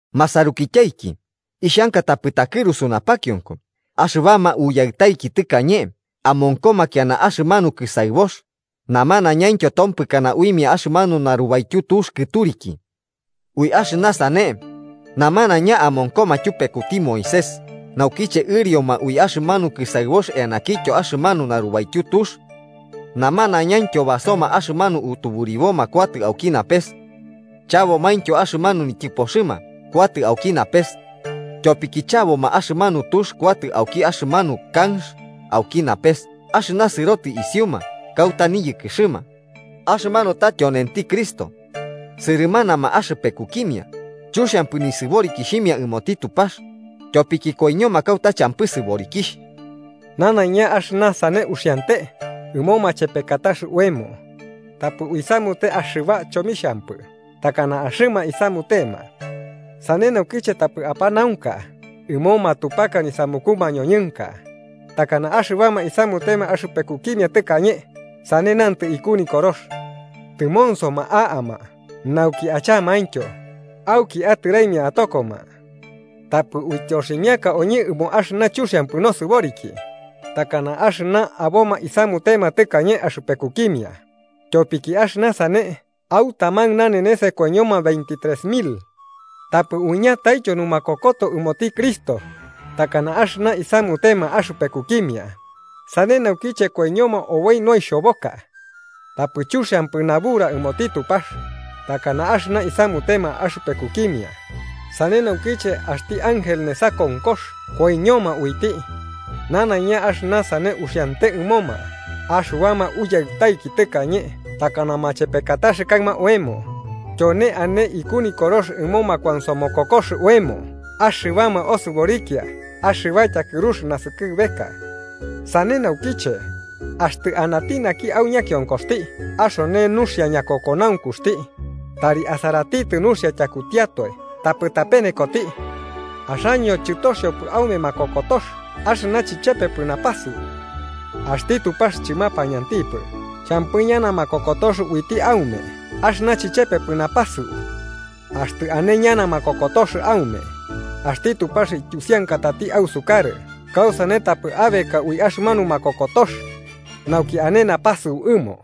Masarukityaiki, ixhanka tapɨ takɨrusu napakionko axɨbama uyaɨtaiki tɨkañe amonkoma kiana axɨmanu kɨsaɨbox, namanaiñaintyo tompɨkana uimia axɨmanu narubaityu Tux Kɨturiki. Ui axɨna sane, namanaiña amonkoma tyupekuti Moisés naukiche ɨrioma ui axɨmanu kɨsaɨbox eanaintyo axɨmanu narubaityu tux. Namanaiñaintyo basoma axɨmanu utuburibo kuatɨ auki napes. Chabomaintyo axɨmanu nityɨpoxɨma kuatɨ auki napes. Tyopiki chaboma axɨmanu tux kuatɨ auki axɨmanu kanx auki napes axɨna sɨrotɨ isiuma kauta niyɨkɨxɨma, axɨmanu ta tyonenti Cristo. Sɨrɨmanama axɨpekukimia, chuxiampɨ nisɨborikixhimia ɨmoti Tupax, tyopiki koiñoma kauta champɨ sɨborikixh. Nanaiña axɨna sane uxiante ɨmo machepekatax oemo, tapɨ uisamute axɨba chomixhampɨ takana axɨma isamutema. Sane naukiche tapɨ apanaunka ɨmo matupaka nisamuku mañoñɨnka, takana axɨbama isamutema axɨpekukimia tɨkañe, sane nantɨ iku Nikorox: “Tɨmonsoma a'ama nauki achamaintyo, auki atɨraimia atokoma.” Tapɨ uityoximiaka oñɨ ɨmo axɨna chuxiampɨ nosɨboriki, takana axɨna aboma isamutema tɨkañe axɨpekukimia, tyopiki axɨna sane au taman nanenes koiñoma veintitres mil. Tapɨ uiñataityo numakokoto ɨmoti Cristo, takana axɨna isamutema axɨpekukimia, sane naukiche koiñoma oboi noixhoboka. Tapɨ chuxiampɨ nabura ɨmoti Tupax, takana axɨna isamutema axɨpekukimia, sane naukiche axti ángel nesa konkox koiñoma uiti. Nanaiña axɨna sane uxiante ɨmoma axɨbama uyaɨtaiki tɨkañe takana machepekatax kaɨma oemo, tyone ane iku Nikorox ɨmo makuansomokokox oemo axɨbama osɨborikia axɨba tyakɨrux naskɨbeka. Sane naukiche, axtɨ anati naki au ñakionkoxti axone nuxia ñakokonaunkuxti, tari asaratitɨ nuxia tyakutiatoe tapɨ tapenekoti. Axaño chɨtoxiopɨ aume makokotox axɨna chichepepɨ napasɨu. Axti Tupax chɨmapañantipɨ champɨ ñana makokotox uiti aume axɨna chichepepɨ napasɨu. Axtɨ ane ñana makokotox aume, axti Tupax ityusiankatati ausukarɨ kausane tapɨ abeka ui axɨmanu makokotox, nauki ane napasɨu ɨmo.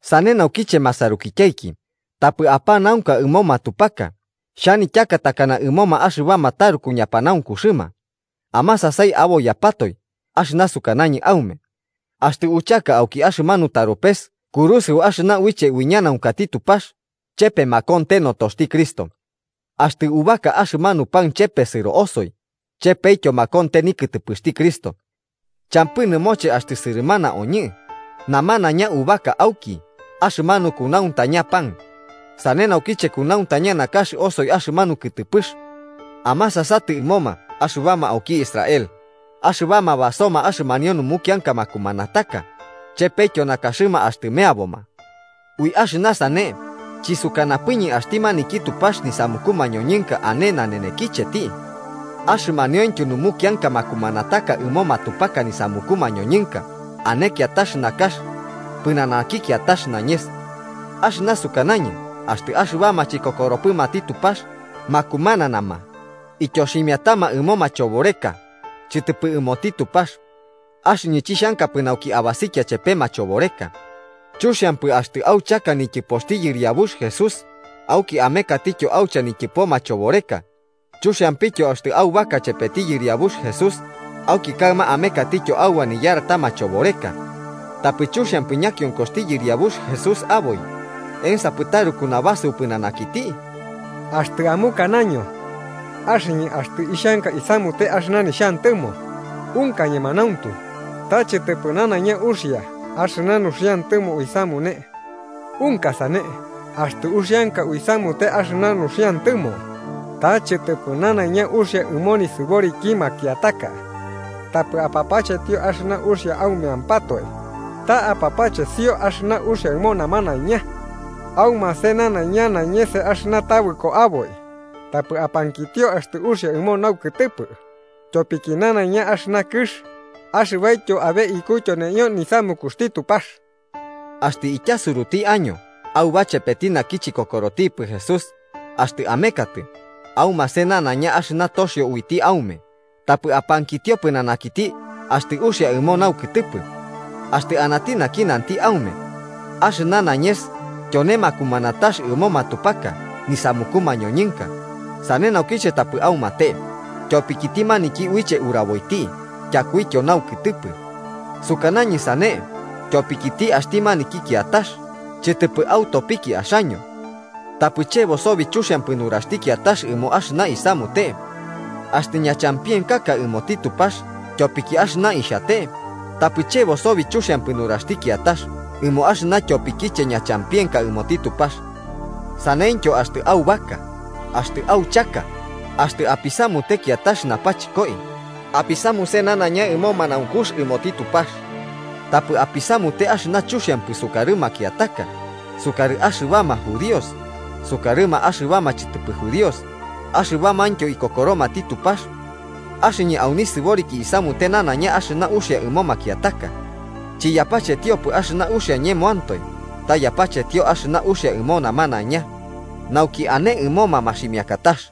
Sane naukiche masarukityaiki, tapɨ apanaunka ɨmo matupaka. Xhanityaka takana ɨmoma axɨbama taruku ñapanaunkuxɨma: amasasai aboiyapatoe axɨna sukanañɨ aume. Axtɨ uchaka auki axɨmanu taropes kurusɨu axɨna uiche uiñanaunkati Tupax, chepe makonte notoxti Cristo. Axtɨ ubaka axɨmanu pan chepesɨro osoi, chepetyo makonte nikɨtɨpɨxti Cristo. Champɨ nɨmoche axtɨ sɨrɨmana oñɨ, namanaiña ubaka auki axɨmanu kunauntaña pan, sane naukiche kunauntaña nakax osoi axɨmanu kɨtɨpɨx. Amasasatɨ ɨmoma axɨbama auki Israel: axɨbama basoma axɨmanio numukianka makumanataka, chepetyo nakaxɨma axtɨ meaboma. Ui axɨna sane chisukanapɨñɨ axti maniki Tupax nisamuku mañoñɨnka ane nanenekicheti, axɨmaniointyo numukianka makumanataka ɨmo matupaka nisamuku mañoñɨnka ane kiatax nakax pɨnanaki kiatax nañes. Axɨna sukanañɨ axtɨ axɨbama chikokoropɨmati Tupax makumananama, ityoximiatama ɨmo machoboreka, chɨtɨpɨ ɨmoti Tupax, axɨñɨ chixhankapɨ nauki abasikia chepe machoboreka. Chuxiampɨ axtɨ auchaka nityɨpoxti Yɨriabux Jesús, auki amekatɨtyo aucha nityɨpo machoboreka. Chuxiampityo axtɨ aubaka chepeti Yɨriabux Jesús, auki kaɨma amekatityo auba niyarta machoboreka. Tapɨ chuxiampɨ ñakionkoxti yɨriabux Jesús aboi. ¿Ensapɨ taruku nubasɨu pɨnanakiti? Axtɨ amukanaño: “Axɨñɨ axtɨ ixhanka isamute axɨna nixhantɨmo.” Unka ñemanauntu, ta chɨtɨpɨ nanaiña uxia axɨna nuxiantɨmo uisamune. Unka sane, axtɨ uxianka uisamute axɨna nuxiantɨmo, ta chɨtɨpɨ nanaiña uxia ɨmo nisɨboriki makiataka. Tapɨ apapachetio axɨna uxia aumeampatoe, ta apapachesio axɨna uxia ɨmo namanaiña. Aumase nanaiña nañes axɨna tabɨko aboi, tapɨ apankitio axtɨ uxia ɨmo naukɨtɨpɨ. Tyopiki nanaiña axɨna kɨx, axɨbaityo abe iku tyoneio nisamukuxti Tupax. Axtɨ ityasurutiaño auba chepeti naki chikokorotipɨ Jesús, axtɨ amekatɨ, aumase nanaiña axɨna toxio uiti aume, tapɨ apankitio pɨnanakiti axtɨ uxia ɨmo naukɨtɨpɨ. Axtɨ anati naki nanti aume: “Axɨna nañes tyone makumanatax ɨmo matupaka nisamuku mañoñɨnka”, sane naukiche tapɨ aumate, tyopikiti maniki uiche uraboiti tyakuityo naukɨtɨpɨ. Sukanañɨ sane tyopikiti axti maniki kiatax, chɨtɨpɨ autopiki axaño. Tapɨ chebo sobi chuxiampɨ nuraxti kiatax ɨmo axɨna isamute. Axtɨ ñachampienkaka ɨmoti Tupax tyopiki axɨna ixhate, tapɨ chebo sobi chuxiampɨ nuraxti kiatax ɨmo axɨna tyopikiche ñachampienkaka ɨmoti Tupax. Saneityo axtɨ aubaka, axtɨ auchaka, axtɨ apisamute kiatax napachɨkoi, apisamuse nanaiña ɨmo manaunkux ɨmoti Tupax. Tapɨ apisamute axɨna chuxiampɨ sukarɨ makiataka. Sukarɨ axɨbama judíos, sukarɨma axɨbama chɨtɨpɨ judíos, axɨbamaintyo ikokoromati Tupax. Axɨñɨ au nisɨboriki isamute nanaiña axɨna uxia ɨmo makiataka, chiyapachetiopɨ axɨna uxia ñemoantoe ta yapachetio axɨna uxia ɨmo namanaiña, nauki ane ɨmoma maximiakatax.